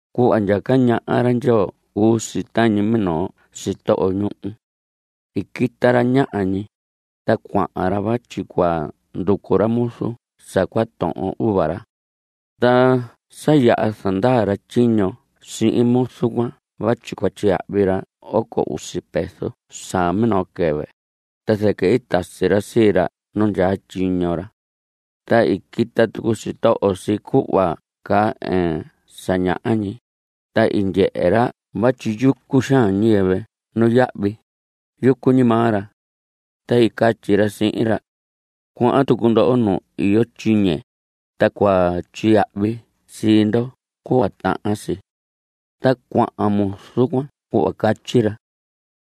Cuhva ndyaca ñaha ra Ndyoo cuu si tañi minoo sitoho ñuhu. I quita ra ñaha ñi, ta cuahan ra vatyi cua nducu ra muzu sa cua tohon uva ra. Ta sa yaha zandaa ra tyiño sihin muzu cuan vatyi cua tyiyahvi ra oco usi peso sa minoo quɨvɨ, ta zɨquɨ i tasi ra sii ra nu ndyaa tyiño ra. Ta i quita tucu sitoho si cuhva caa ɨɨn sa ñaha ñi, ta i ndyehe ra vatyi yucu xaan ñiyɨvɨ nuyahvi, yucu ñi maa ra. Ta i catyi ra sihin ra: Cuahan tucu ndoho nu iyo tyiñe, ta cua tyiyahvi sii ndo cuhva tahan si. Ta cuahan muzu cuan cuhva catyi ra.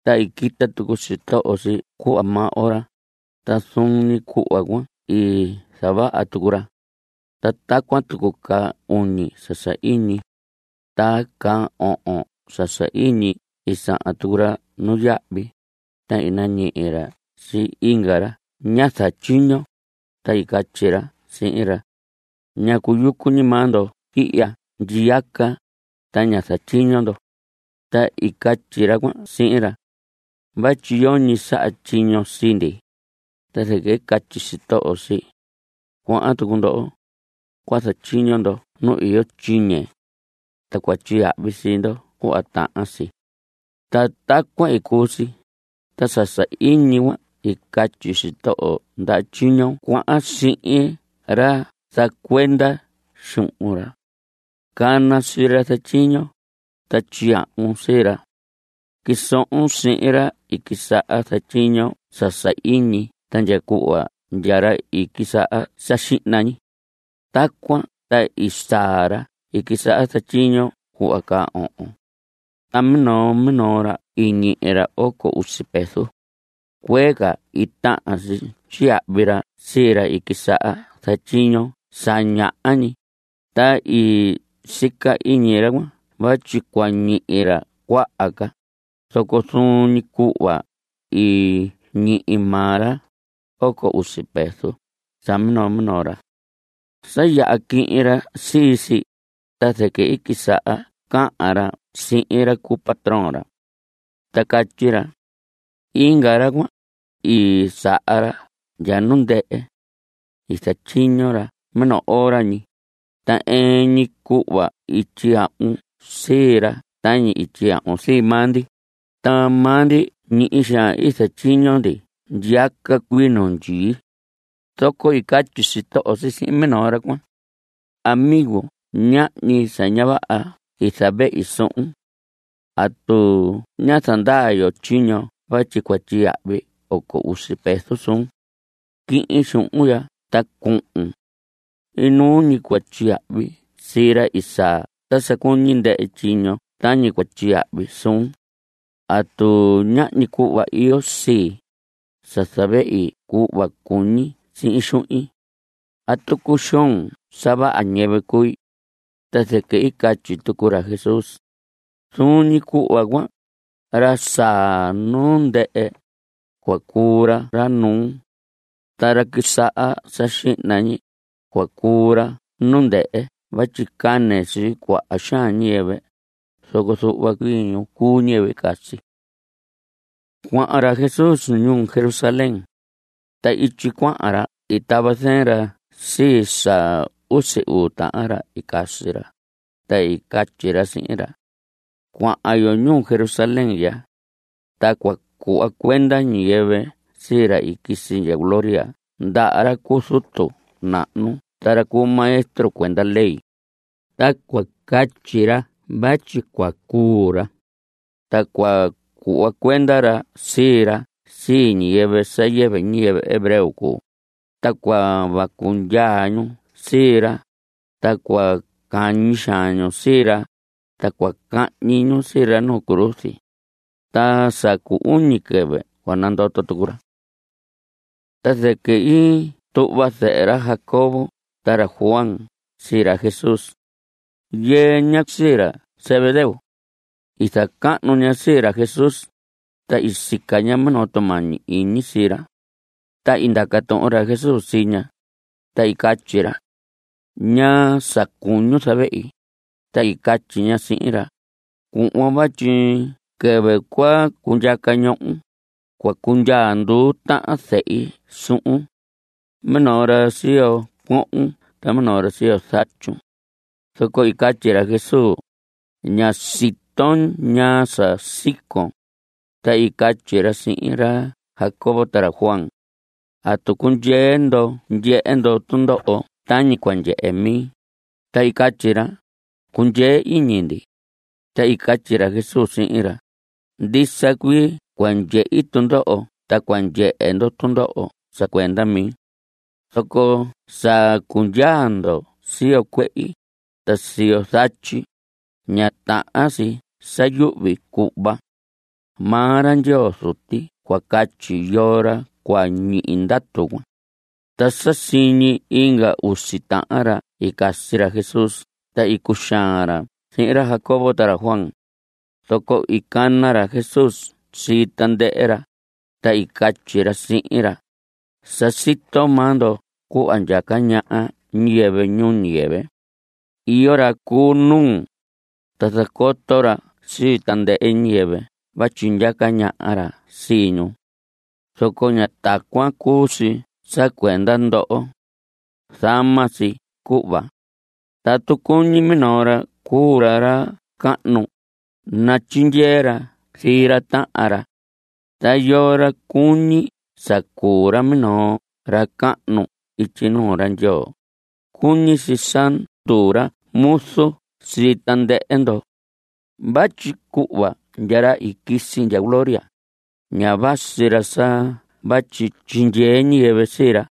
Ta i quita tucu sitoho si cuhva maa ora, ta zuun ñi cuhva cuan i zavaha tucu ra. Ta tacuan tucu caa uñi sa sahiñi. Ta caa ohon sa sahiñi i sahan tucu ra nuyahvi, ta i nañihi ra sii inga ra ña zatyiño, ta i catyi ra sihin ra: “¿Ñacu yucu ñi maa ndo ihya ndyiyaca, ta ña zatyiño ndo?” Ta i catyi ra cuan sihin ra: “Vatyi yoñi i saha tyiño sii ndi.” Ta zɨquɨ i catyi sitoho si: “Cuahan tucu ndoho. Cua zatyiño ndo nu iyo tyiñe. Ta cua tyiyahvi sii ndo cuhva tahan si.” Ta tacuan i cuu si, ta sa sahiñi cuan i catyi sitoho ndaha tyiño cuan sihin ra zacuenda xuhun ra: “Cana sii ra zatyiño, ta tyiyahvun sii ra. Quisohon sihin ra i quisaha zatyiño sa sahiñi ta ndya cuhva ndya ra i quisaha sa xihna ñi.” Tacuan ta i saa ra i quisaha zatyiño cuhva caa ohon. Ta minoo minoo ra i ñihi ra oco usi peso. Cuee ca i tahan si tyiyahvi ra sii ra i quisaha zatyiño sa ñaha ñi, ta i sica iñi ra cuan vatyi cua ñihi ra cuaha ca, zoco zuun ñi cuhva i ñihi maa ra, oco usi peso sa minoo minoo ra. Sa yaha quihin ra sii si, ta zɨquɨ i quisaha cahan ra sii ra cu patrón ra. Ta catyi ra: “Inga ra cuan, i saa ra ndya nu ndɨhɨ. I zatyiño ra minoo ora ñi, ta ɨɨn ñi cuhva i tyiyahvun sii ra tañi i tyiyahvun sii maa ndi, ta maa ndi ñihi xaan i zatyiño ndi ndyiyaca cuii nu ndyii.” Zoco i catyi sitoho si sihin minoo ra cuan: “Amigo, ñahñi sa ña vaha i zavehi suhun. ¿Atu ñá zandaa yo tyiño vatyi cua tyiyahvi oco usi peso suun? Quihin xuhun ya ta cuhun. Inuu ñi cua tyiyahvi sii ra i saa ta sa cuñi ndɨhɨ tyiño tañi cua tyiyahvi suun. ¿Atu ñahñi cuhva iyo sii, sa zavehi cuhva cuñi sihin xuhin? ¿Atu cuxoon sa vaha ñiyɨvɨ cui?” Ta zɨquɨ i catyi tucu ra Jesús: Zuun ñi cuhva cuan, ra saa nu ndɨhɨ, cua cuu ra ra nuu. Ta ra quisaha sa xihna ñi, cua cuu ra nu ndɨhɨ vatyi cane sii cuaha xaan ñiyɨvɨ, zoco zuhva cuii ñi cuu ñiyɨvɨ i casi. Cuahan ra Jesús ñuu Jerusalén. Ta ityi cuahan ra i tava zɨɨn ra sii sa usi uu tahan ra i casi ra, ta i catyi ra sihin ra: Cuahan yo ñuu Jerusalén ya. Ta cua cuhva cuenda ñiyɨvɨ sii ra i quisi ndya gloria ndaha ra cu zutu nahnu ta ra cu maestro cuenda ley, ta cua catyi ra vatyi cua cuu ra. Ta cua cuhva cuenda ra sii ra sii ñiyɨvɨ sa yɨvɨ ñiyɨvɨ hebreo cuu, ta cua vacu ndyaa ñu sii ra, ta cua cañi xaan ñu sii ra, ta cua cahñi ñu sii ra nu cruz. Ta sa cu uñi quɨvɨ cua nandoto tucu ra. Ta zɨquɨ i tuhva zɨhɨ ra Jacobo ta ra Juan sii ra Jesús. Yɨɨ ña sii ra Zebedeo. I zacahnu ña sii ra Jesús, ta i sica ña minoo tumañi iñi sii ra. Ta i ndaca tuhun ra Jesús sii ña, ta i catyi ra: ¿Ñaa sa cuñun zavehi? Ta i catyi ña sihin ra: Cuhvon vatyi quɨvɨ cua cundyaca ñohon, cua cundyaa nduu tahan zehi suhun. Minoo ra siyo cuohon ta minoo ra siyo zatyun. Zoco i catyi ra Jesús: Ña siton ñaa sa sicon. Ta i catyi ra sihin ra Jacobo ta ra Juan: ¿Atu cundyee ndoho ndyehe ndo tundoho tañi cua ndyehe mi? Ta i catyi ra: Cundyee iñi ndi. Ta i catyi ra Jesús sihin ra: Ndisa cuii cua ndyehi tundoho ta cua ndyehe ndoho tundoho sa cuenda mi. Zoco sa cundyaa ndo siyo cuehi, ta siyo zatyi, ña tahan si sa yuhvi cuhva. Maa ra Ndyoo Zuti cua catyi yoo ra cua ñihi ndatu cuan. Ta sa siñi inga usi tahan ra i casi ra Jesús ta i cuxaan ra sihin ra Jacobo ta ra Juan. Zoco i cana ra Jesús sii tandɨhɨ ra, ta i catyi ra sihin ra: Sa sito maa ndo cuhva ndyaca ñaha ñiyɨvɨ ñuu ñiyɨvɨ. Iyo ra cu nuu, ta zacoto ra sii tandɨhɨ ñiyɨvɨ vatyi ndyaca ñaha ra sii ñu. Zoco ña tacuan cuu si sa cuenda ndoho. Zama si cuhva. Tatu cuñi minoo ra cuu ra ra cahnu, natyindyee ra sii ra tahan ra. Ta yoo ra cuñi sa cuu ra minoo ra cahnu ityi nuu ra Ndyoo, cuñi si sa nduu ra muzu sii tandɨhɨ ndo. Vatyi cuhva ndya ra i quisi ndya gloria, ña vasi ra sa vatyi tyindyee ñiyɨvɨ sii ra.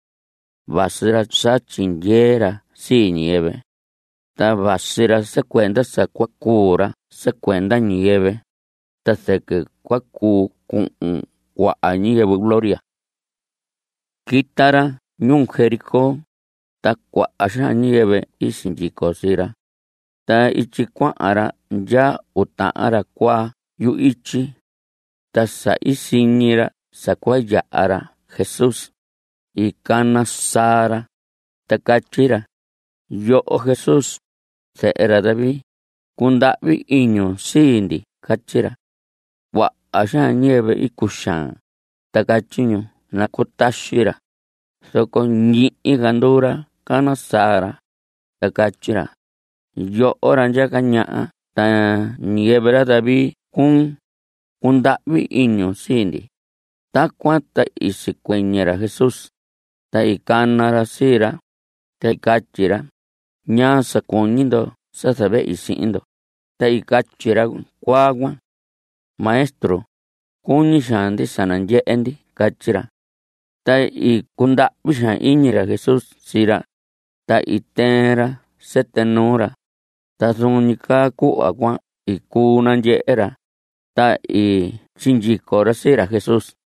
Vasi ra sa tyindyee ra sii ñiyɨvɨ. Ta vasi ra sa cuenda sa cua cuu ra sa cuenda ñiyɨvɨ, ta zɨquɨ cua cuu cuhun cuaha ñiyɨvɨ gloria. Quita ra ñuu Jericó, ta cuaha xaan ñiyɨvɨ i sindyico sii ra. Ta ityi cuahan ra ndyaa uu tahan ra cuaa yu‑ityi. Ta sa i siñi ra sa cua yaha ra Jesús, i cana saa ra, ta catyi ra: ¡Yoho Jesús, zehe ra David, cundahvi iñun sii ndi! Catyi ra. Cuaha xaan ñiyɨvɨ i cuxaan, ta catyi ñu nacutaxi ra, zoco ñihi ca nduu ra cana saa ra, ta catyi ra: ¡Yoho ra ndyaca ñaha ta ñiyɨvɨ ra David cuun! ¡Cundahvi iñun sii ndi! Tacuan ta i sicuɨñɨ ra Jesús, ta i cana ra sii ra, ta catyi ra: ¿Ñaa sa cuñi ndo sa zavehi sihin ndo? Ta i catyi ra cuaa cuan: Maestro, cuñi xaan ndi sa nandyehe ndi. Catyi ra. Ta i cundahvi xaan iñi ra Jesús sii ra, ta i tɨɨn ra sɨtɨ nuu ra, ta zuun ñi caa cuhva cuan i cuu nandyehe ra, ta i sindyico ra sii ra Jesús.